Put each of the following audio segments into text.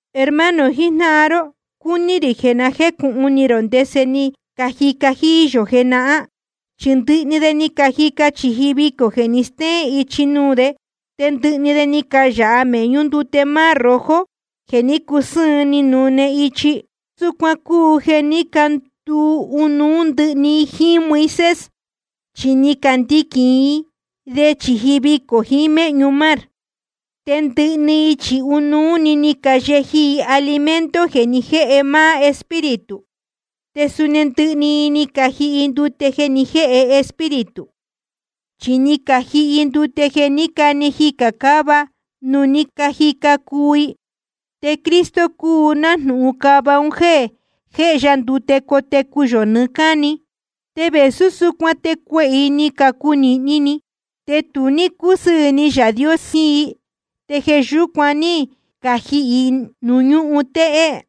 Hermano jijnáhan ró, cúní rī jeē na jécūhun ni rō ndese ni cajica jíí yō jenahán. Chi ndɨhɨ de ni cajica chīji vicō jeē ni stéén ichi nuū de, te ndɨhɨ de ni cayāha mēhñú ndute Mar Rojo jeē ní cusɨ́ɨn, ni nune ichi. Súcuan cúu jeē ní canduu ɨnuú ndɨhɨ i jíín Moisés, chi ni candiquīn i de chīji vicō jiín méhñu mar. Te ndɨhɨ i chi ɨnuú‑ni ni cayeji i alimento jeē ni jéhe máá Espíritu. Te suni ndɨhɨ i ni cajihi ndute jeē ni jéhe Espíritu. Chi ni cajihi i ndute jeē ní cane jicā cáva nuū ní cajica cuu i. Te Cristo cúu nájnūhun cava un jéē jéhe ya ndute cotecu yō nɨɨ́ cáni. Te vēsú súcuan te cuehē i ni cunīhni ni i, te tu ní cúsɨɨ̄ ni Yaā Dios jiín i, te jeē yúcuan ní cajihī i nuū ñúhun téhé.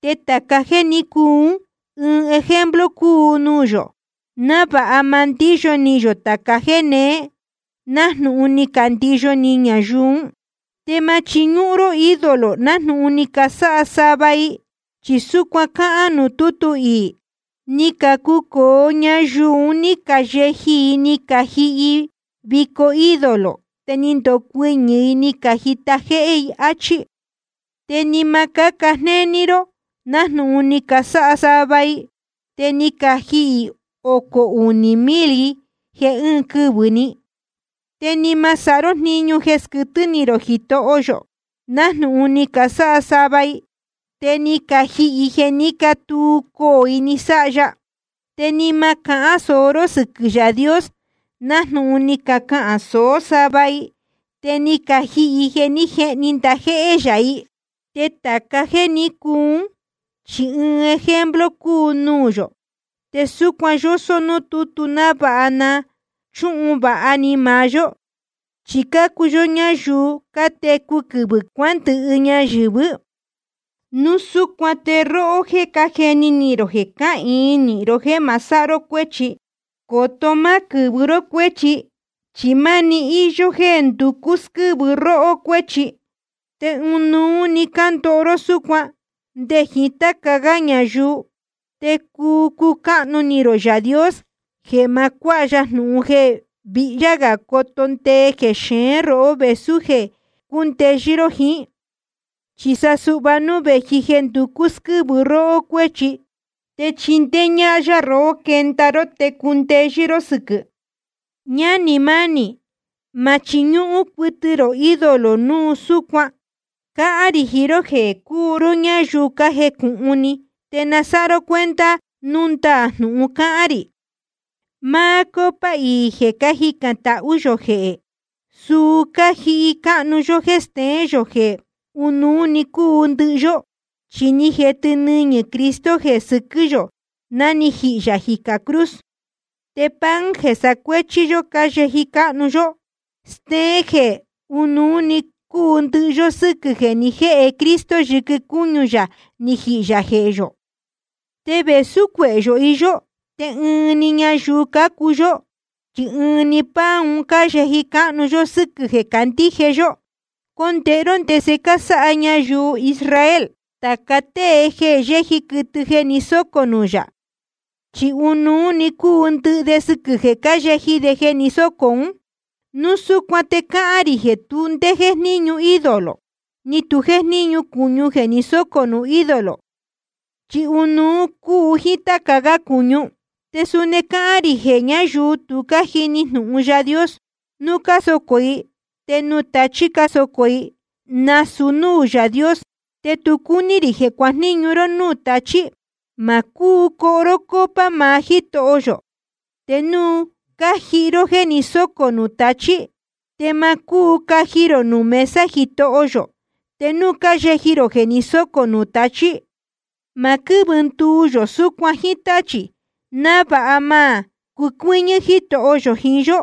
Te tāca jéē ní cuu ún, ɨɨn ejemplo cúu nuū yō, návāha ma ndíyo ni yō tāca jéē neé, nájnūhun ni candiyo ni ñayuu ún. Te ma chiñúhún ró ídolo, nájnūhun ni casáha sava i. Chi súcuan cáhán nuū tútu iī: Ni cacucōo ñayuu ún, ni cayeji i ni cajihi i vico ídolo, te ni ndocuɨñɨ̄ i ni cajita jéhé i, áchí. Te ni ma cáca jnéní ró nájnūhun ni casáha sava i, te ni cajihī ocō unī mil i jeē ɨɨn quɨvɨ̄‑ni. Te ni ma sáha ró jniñu jeē squɨtɨ́ ni rō Jitoho yō, nájnūhun ni casáha sava i, te ni cajihī i jeē ní catuu coō i, ni sáha ya. Te ni ma cahán sōó ró sɨquɨ̄ Yaā Dios, nájnūhun ni cacahān sōó sava i, te ni cajihī i jeē ní jehni ndajéhé yā i. Te tāca jéē ní cuu ún, chi ɨɨn ejemplo cúu nuū yō. Te súcuan yósó núū tútu návāha na chúhun vāha ni maá yó. Chi cácuu yó ñayuu cátecu quɨvɨ̄ cuándɨhɨ ñayɨ̄vɨ́. Núu súcuan te róhó jéē cájeni ni rō jeē cáhīin nīhin ró jéē ma sáha ró cuéchi, coto má quɨ̄vɨ ró cuéchi. Chi máni íyó jéē nducú squɨ́vɨ róhó cuēchi, te ɨnuú‑ni cándoho ró súcuan nde jiín táca gá ñayuu. Te cuu cucáhnu ni rō Yaā Dios jeē ma cuáha ya jnūhun jeē vihyá gā coto ndee jexeén róhó vēsú jeē cúu cundeyɨ́ ró jiín. Chi sa suhva núu vēji jeē nducú squɨ́vɨ róhó cuéchi, te chindéé ñáhán yá rohó quenda ró te cundeyɨ́ ró sɨquɨ̄. Ñánī mánī, ma chiñúhún cuɨtɨ rō ídolo núu súcuan. Cáhán rī jiín ró jéē cúu ró ñáyuu cájecūhun ni, te na sáha ró cuenta núu ndaā jnūhun cáhán rī. Máá copa iī jeē cájicān tahú yō jehē, suu cájihi cáhnu yó jéē steén yō jeē ɨnuú cúu ndɨhɨ yó, chi ni jetɨ nɨñɨ̄ Cristo jeē sɨquɨ́ yō ná ni jihī yā jicā cruz. Te pan jeē sacuéchí yó cáyeji cáhnu yó, stéén jeē ɨnuú cúu ndɨhɨ yó sɨ́quɨ̄ jeē ni jéhe Cristo yɨquɨ cúñu yā ni jihī yā jehē yō. Te vēsú cuehē yō iyó, te ɨɨn‑ni ñayuu cácuu yó, chi ɨɨn‑ni pan un cáyeji cáhnu yó sɨ́quɨ̄ jeē cácandíje yó. Condēhe ró ndese cásáha ñayuu Israel. Tāca tée jeē yéji quɨtɨ jeē ni sócō nuū yā, chi ɨnuú‑ni cúu ndɨhɨ de sɨquɨ̄ jeē cáyeji de jeē ni sócō ún. Núu súcuan te cáhán rī jeē tu ndé jéjníñu ídolo, ni tu jéjníñu cūñu jeē ni sócō nuū ídolo, chi ɨnuú cúu jíín táca gá cūñu. Te suni cáhán rī jeē ñáyuu tu cájini jnūhun Yaā Dios, núu cásocō i, te nuū tachī cásocō i, nasūu núū Yaā Dios. Te tu cúní rī jeē cuajníñu ró núū tachī. Ma cúu coho ró copa maá Jítoho yō te núu cájihi ró jéē ni sócō nuū tachī. Te ma cúu caji rō nuū mesa Jitoho yō te núu cáyeji rō jeē ni sócō nuū tachī. Ma quɨ́vɨ nduu yō súcuan jíín táchī, návāha ma cucuɨ́ñɨ́ Jítoho yō jiín yó.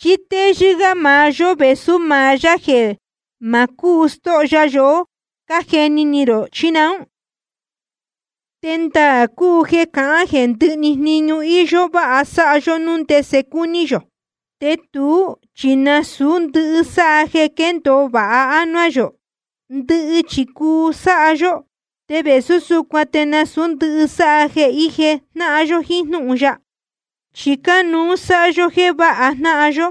¿Chí téyɨ́ gá maá yó vēsú maá yá jeē ma cúu stóho ya yohó, cájeni ni rō, chí naún? Te ndaā cúu jeē cácahān jeē ndɨhɨ‑ni jniñu íyó váha sáha yó núu ndese cúní yō. Te tuú chi nasūú ndɨhɨ sáha jeē quéndōo vāha ánuá yō. Ndɨhɨ chi cuu sáha yó, te vēsú súcuan te nasūú ndɨhɨ sáha jeē ije jnáhan yó jiín jnúhun ya. Chi cánuú sáha yó jéē váha jnáhan yó,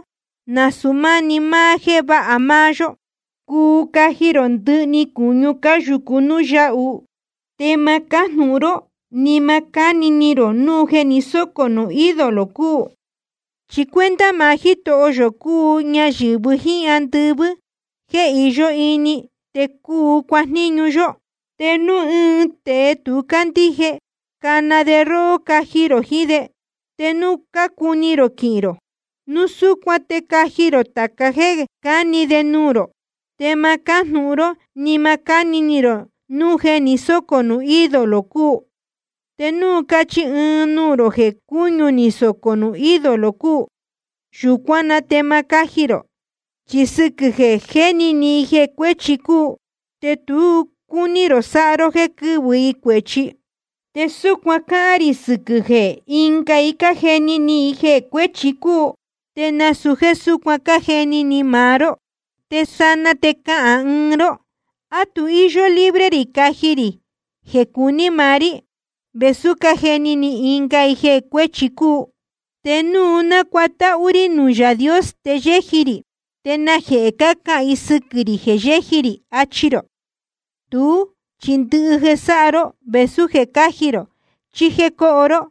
nasūu máni máá jéē váha máá yó. Cuu caji rō ndɨhɨ‑ni cūñu cúyāhu nuū yáhu, te ma cájnūhun ró ni ma cáni ni rō núu jeē ni sócō nuū ídolo cúu. Chi cuenta maá Jítoho yō cúu ñayɨ̄vɨ jíín ndɨvii jeē iyó ini, te cuu cuajníñu yó. Te núu ɨɨn tēe tu cándíje, cana de róhó caji rō jiín de, te núu cácuni rō quihīn rō, núu súcuan te caji rō tāca jéē cáni de nuū rō. Te ma cájnūhun ró ni ma cáni ni rō núu jeē ni sócō nuū ídolo cúu. Te núu cachi ɨɨn i nuū rō jeē cūñu ni sócō nuū ídolo cúu, yūcuán na te ma cáji rō, chi sɨquɨ̄ jeē jéni ni i jeē cuēchi cúu, te tu cúní rō sáha ró jéē quɨ́vɨ i cuēchi. Te súcuan cáhán rī sɨquɨ̄ jeē ɨnga i cájeni ni i jeē cuēchi cúu, te nasūu jéē súcuan cájeni ni maá ró. Te sanaa te cahān ɨɨn ró: ¿A tu íyó libre rī caji rī jeē cuní maá rí, vēsú cájeni ni ɨnga i jeē cuēchi cúu? ¿Te núu nácuatáhú rí nuū Yaā Dios te yéji rī, te najehē cácahān i sɨquɨ̄ rī jeē yéji rī? achi rō. Tuú chi ndɨhɨ jeē sáha ró, vēsú jeē caji rō chí jéē coho ró,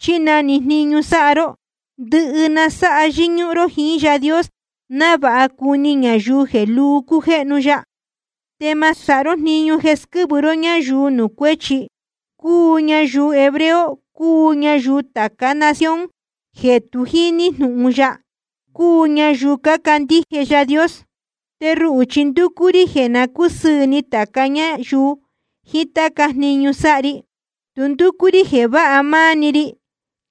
chí na‑ni jniñu sáha ró, ndɨhɨ na sáha yɨ́ñúhún ró jíín Yaā Dios, návāha cuni ñayuu jeē luu cújéhnu ya. Te ma sáha ró jniñu jeē squɨ́vɨ ró ñáyuu nuū cuéchi, cúu ñayuu hebreo, cúu ñayuu tācá nación jeē tu jíní jnūhun ya, cúu ñayuu cácandíje Yaā Dios. Te ruhū chi ndúcú rí jeē na cúsɨɨ̄ ni tāca ñáyuu jiín táca jniñu sáha ri. Tu ndúcú rí jeē váha máá‑ni ri,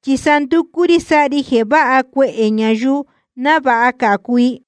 chi sa ndúcú rí sáha ri jeē váha cuehē ñayuu, návāha cācu i.